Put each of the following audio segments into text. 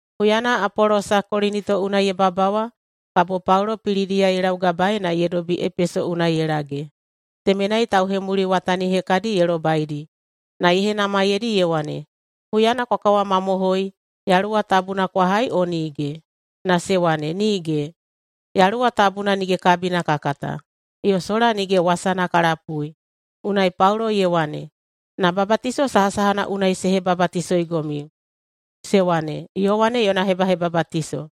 Huyana Apolosa Kolinito unai ye babawa, kabo Paulo Pilidiya ye laugabaei na ye dobi Epeso unai ye lage. Temenai tauhemuliwatani hekadi ye lobaidi na ye henamaiyeidi ye wane, “Huyana kwa kawamamohoi, Yaluwa Tabuna kwa hai, o nige?” Na se wane, “Nige! Yaluwa Tabuna nige kabina ka kata, yo sola nige wasana ka lapui.” Unai Paulo ye wane, “Na babatiso sahasahana unai se hebabatisoigomiu?” Se wane, “Yowane yona hebahebabatiso.”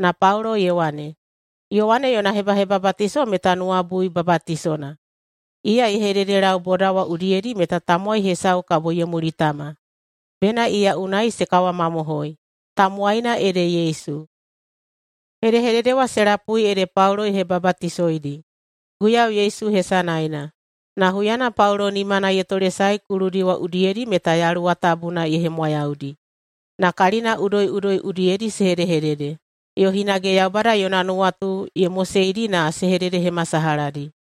Na Paulo ye wane, “Yowane yona hebahebabatiso meta nuwabui babatisona. Iya ye hededelau boda wa udiyedi meta tamowai hesau kabo ye mulitama, bena iya unai se kawamamohoi. Tamowaina ede Yesu.” Hedehedede wa se lapui ede Paulo ye hebabatisoidi Guiyau Yesu hesanaena. Na huyana Paulo nimana ye tolesae kuludi wa udiyedi meta Yaluwa Tabuna ye hemwayaudi, na kalina udoiꞌudoi udiyedi se hedehedede, yo hinage Yaubada yona nuwatu ye moseidi na se hededehemasalahadi.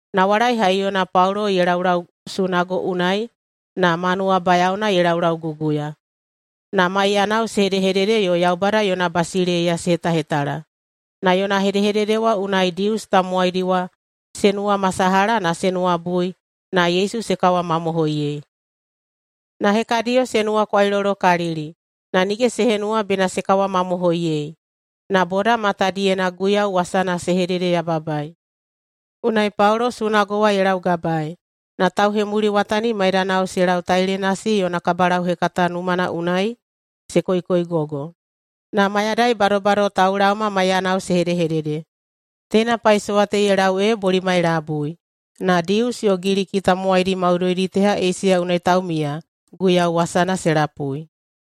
Nawalai haiyona Paulo ye laulau sunago unai na ma nuwabayaona ye laulauguguya. Na maiyanao se hedehedede yo Yaubada yona basileiya se hetahetala, na yona hedehedede wa unai Dius tamowaidi wa se nuwamasalaha na se nuwabui na Yesu se kawamamohoiyei. Na hekadiyo se nuwakwailolokalili, na nige se henuwa bena se kawamamohoiyei, na boda matadiyena Guiyau wasana se hededeyababaei. Unai Paulo sunago wa ye laugabaei, na tauhemuliwatani maidanao se lau Tailenasi yona kabalauhekata numana unai se koikoigogo. Na mayadai badobado taulaoma maiyanao se hedehedede. Teina paisowa te ye lau ee bolimai labui. Na Dius yo Giliki tamowaidi maudoidi teha Eisiya unai taumiya Guiyau wasana se lapui.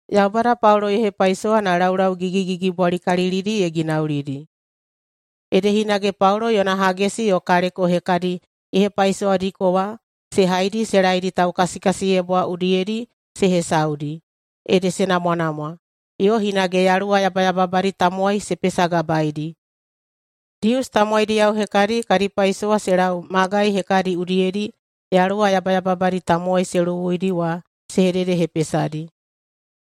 Yaubada Paulo ye hepaisowa na laulau gigigigibwalikalilidi ye ginaulidi, ede hinage Paulo yona hagesi yo kaleko hekadi ye hepaisowadiko wa se haidi se laedi taukasikasiyebwa udiyedi se hesaudi, ede se namwanamwa, yo hinage yaluwa yabayababadi tamowai se pesagabaedi. Dius tamowaidiyao hekadi kadi paisowa se lau magai hekadi udiyedi yaluwa yabayababadi tamowai se luwuidi wa se hededehepesadi,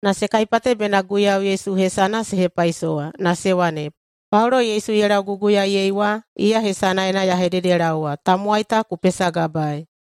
na se kaipate bena Guiyau Yesu hesana se hepaisowa, na se wane, “Paulo Yesu ye lauguguyaei wa, iya hesanaena ya hededelaowa: Tamowai ta ku pesagabaei!”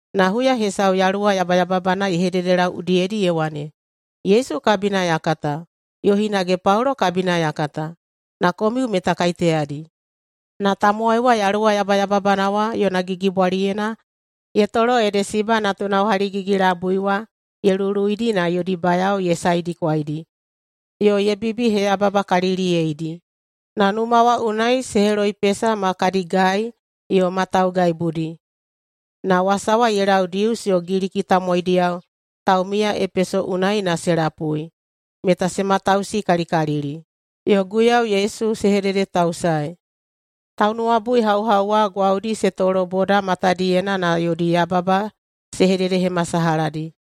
Na huya hesau yaluwa yabayababana ye hededelau udiyedi ye wane, “Yesu kabina ya kata, yo hinage Paulo kabina ya kata. Na komiu meta kaiteyadi?” Na tamowai wa yaluwa yabayababana wa yona gigibwaliyena ye tolo ede Siba natunao haligigi-labui wa ye luluidi na yodi bayao ye saedikwaidi yo ye bibiheyababakaliliyeidi, na numa wa unai se heloipesa ma kadi gai yo ma taugaibudi. Na wasa wa ye lau Dius yo Giliki tamowaidiyao taumiya Epeso unai na se lapui, meta se matausikalikalili, yo Guiyau Yesu se hededetausaei. Taunuwabuihauhau wa gwaudi se tolo boda matadiyena na yodi yababa se hededehemasalahadi.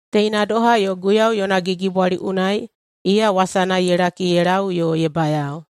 Teina doha yo Guiyau yona gigibwali unai iya wasana ye laki ye lau yo ye bayao.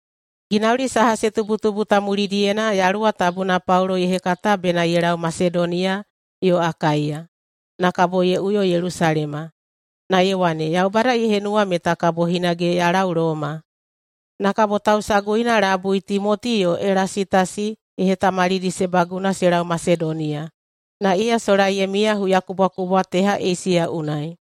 Ginauli saha se tubutubu ta mulidiyena Yaluwa Tabuna Paulo ye hekata bena ye lau Masedoniya yo Akaiya, na kabo ye uyo Yelusalema. Na ye wane, “Yaubada ye henuwa meta kabo hinage ya lau Loma.” Na kabo tausaguina labui Timoti yo Elasitasi ye hetamalidi se baguna se lau Masedoniya, na iya sola ye miya huyakubwakubwa teha Eisiya unai.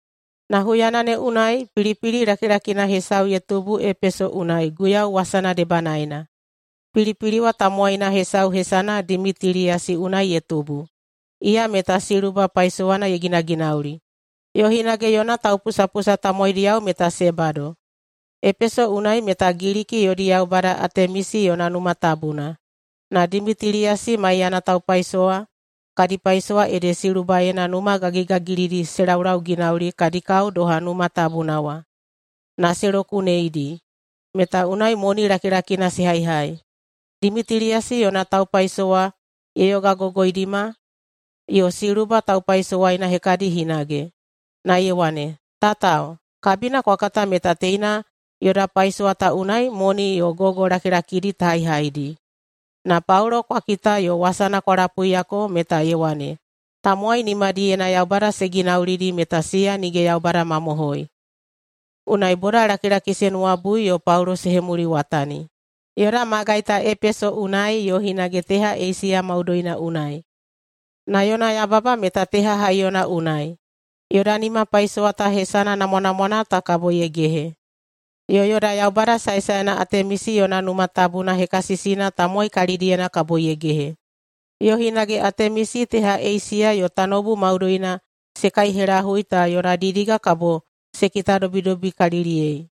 Na huyana ne unai pilipili lakilakina hesau ye tubu Epeso unai Guiyau wasana debanaena. [Pilipili wa tamowai hesau hesana Dimitiliyasi unai ye tubu.] Iya meta siluba paisowana ye ginaginauli, yo hinage yona taupusapusa tamowaidiyao meta se bado. Epeso unai meta Giliki yodi yaubada Atemisi yona numa tabuna. Na Dimitiliyasi maiyana taupaisowa kadi paisowa ede silubaena numa gagigagilidi se laulauginauli kadi kao doha numa tabuna wa, na se lokuneidi, meta unai moni lakilakina se haihai. Dimitiliyasi yona taupaisowa ye yogagogoidima, yo siluba taupaisowaina hekadi hinage, na ye wane, “Tatao, kabina kwa kata meta teina yoda paisowa ta unai moni yo gogo lakilakidi ta haihaidi. Na Paulo kwa kita yo wasana kwa lapuiyako meta ye wane, ‘Tamowai nimadiyena yaubada se ginaulidi meta siya nige yaubada mamohoi.’ Unai bodalakilaki se nuwabui yo Paulo se hemuliwatani, yoda magai ta Epeso unai, yo hinage teha Eisiya maudoina unai. Na yona yababa meta teha haiyona unai: Yoda nimapaisowa ta hesana namwanamwana ta kabo ye gehe, yo yoda yaubada saesaena Atemisi yona numa tabuna hekasisina tamowai kalidiyena kabo ye gehe, yo hinage Atemisi teha Eisiya yo tanoubu maudoina se kaihelahui ta yona didiga kabo se kitadobidobikaliliyei.”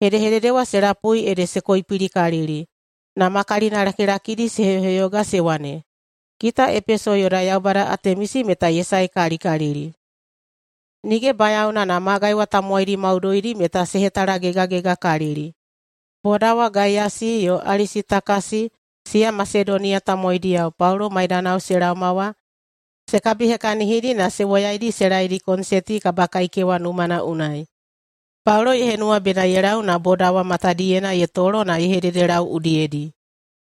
Hedehedede wa se lapui ede se koipilikalili na ma kalinalakilakidi se heyoheyoga se wane, “Kita Epeso yoda yaubada Atemisi meta ye saekalikalili!” Nige bayaona na magai wa tamowaidi maudoidi meta se hetalagegagegakalili. Boda wa Gaiyasi yo Alisitakasi siya Masedoniya tamowaidiyao Paulo maidanao se laoma wa se kabihekahinidi na se woyaidi se laedi konseti kabakaikewa numana unai. Paulo ye henuwa bena ye lau na boda wa matadiyena ye tolo na ye hedehededelau udiyedi,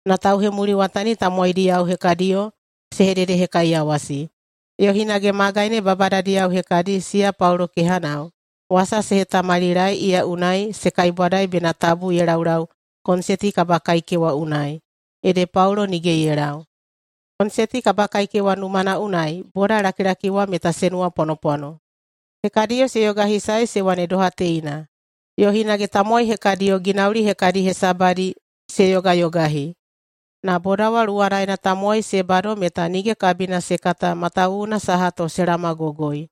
na tauhemuliwatani tamowaidiyao hekadiyo se hededehekaiyawasi. Yo hinage magai ne babadadiyao hekadi, siya Paulo kehanao, wasa se hetamalilaei iya unai se kaibwadaei bena tabu ye laulau konseti kabakaikewa unai. Ede Paulo nige ye lau. Konseti kabakaikewa numana unai bodalakilaki wa meta se nuwapwanopwano. Hekadiyo se yogahisae se wane doha teina, yo hinage tamowai hekadiyo ginauli hekadi hesabadi se yogayogahi, na boda wa luwanaena tamowai se bado meta nige kabina se kata matawuwuna saha to se laomagogoi.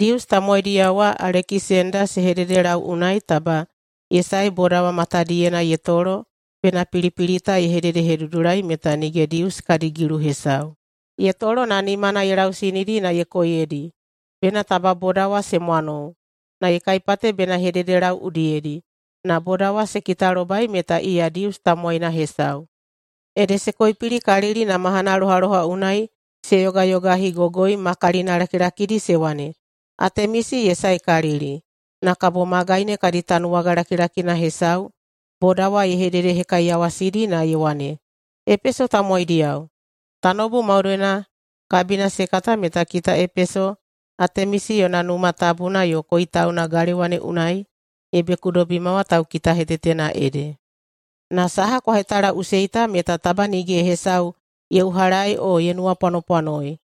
Dius tamowaidiyao wa Alekisenda se hededelau unai taba ye sae boda wa matadiyena ye tolo bena pilipili ta ye hededehedudulai meta nige Dius kadi gilu hesau. Ye tolo na nimana ye lausinidi na ye koiyedi bena taba boda wa se mwanou, na ye kaipate bena ye hededelau udiyedi. Na boda wa se kitalobai meta iya Dius tamowaina hesau, ede se koipilikalili na mahanalohaloha unai se yogayogahigogoi ma kalinalakilakidi se wane, “Atemisi ye saekalili!” Na kabo magai ne kadi tanuwaga lakilakina hesau boda wa ye hededehekaiyawasidi na ye wane, “Epeso tamowaidiyao! Tanoubu maudoina kabina se kata meta kita Epeso Atemisi yona numa tabuna yo koitauna galewa ne unai ye bekudobima wa taukitahetetena ede. Na saha kwa hetalaꞌusei ta meta taba nige hesau ye uhalaei o ye nuwapwanopwanoei.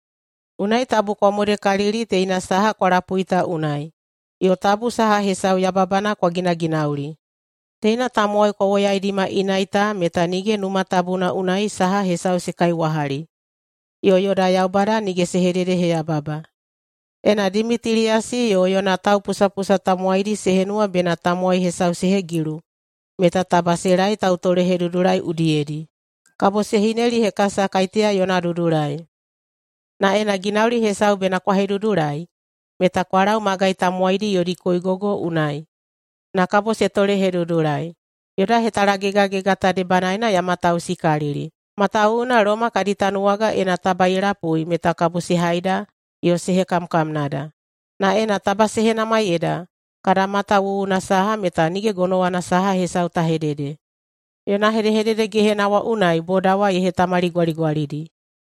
Unai tabu kwa modekalili teina saha kwa lapui ta unai, yo tabu saha hesau yababana kwa ginaginauli. Teina tamowai kwa woyaidima inai ta meta nige numa tabuna unai saha hesau se kaiwahali, yo yoda yaubada nige se hededeheyababa. Ena Dimitiliyasi yo yona taupusapusa tamowaidi se henuwa bena tamowai hesau se hegilu, meta taba se laei tautolehedudulai udiyedi, kabo se hinelihekasa kaiteya yona dudulai. Na ena ginauli hesau bena kwa hedudulai, meta kwa lau magai tamowaidi yodi koigogo unai, na kabo se tolehedudulai. Yoda hetalagegagega ta debanaena ya matausikalili, matawuwuna Loma kadi tanuwaga ena taba ye lapui meta kabo se haida yo se hekamkamnada. Na ena taba se henamaiyeida kada mata wuwuna saha, meta nige gonowana saha hesau ta hedede.” Yona hedehedede gehena wa unai boda wa ye hetamaligwaligwalidi.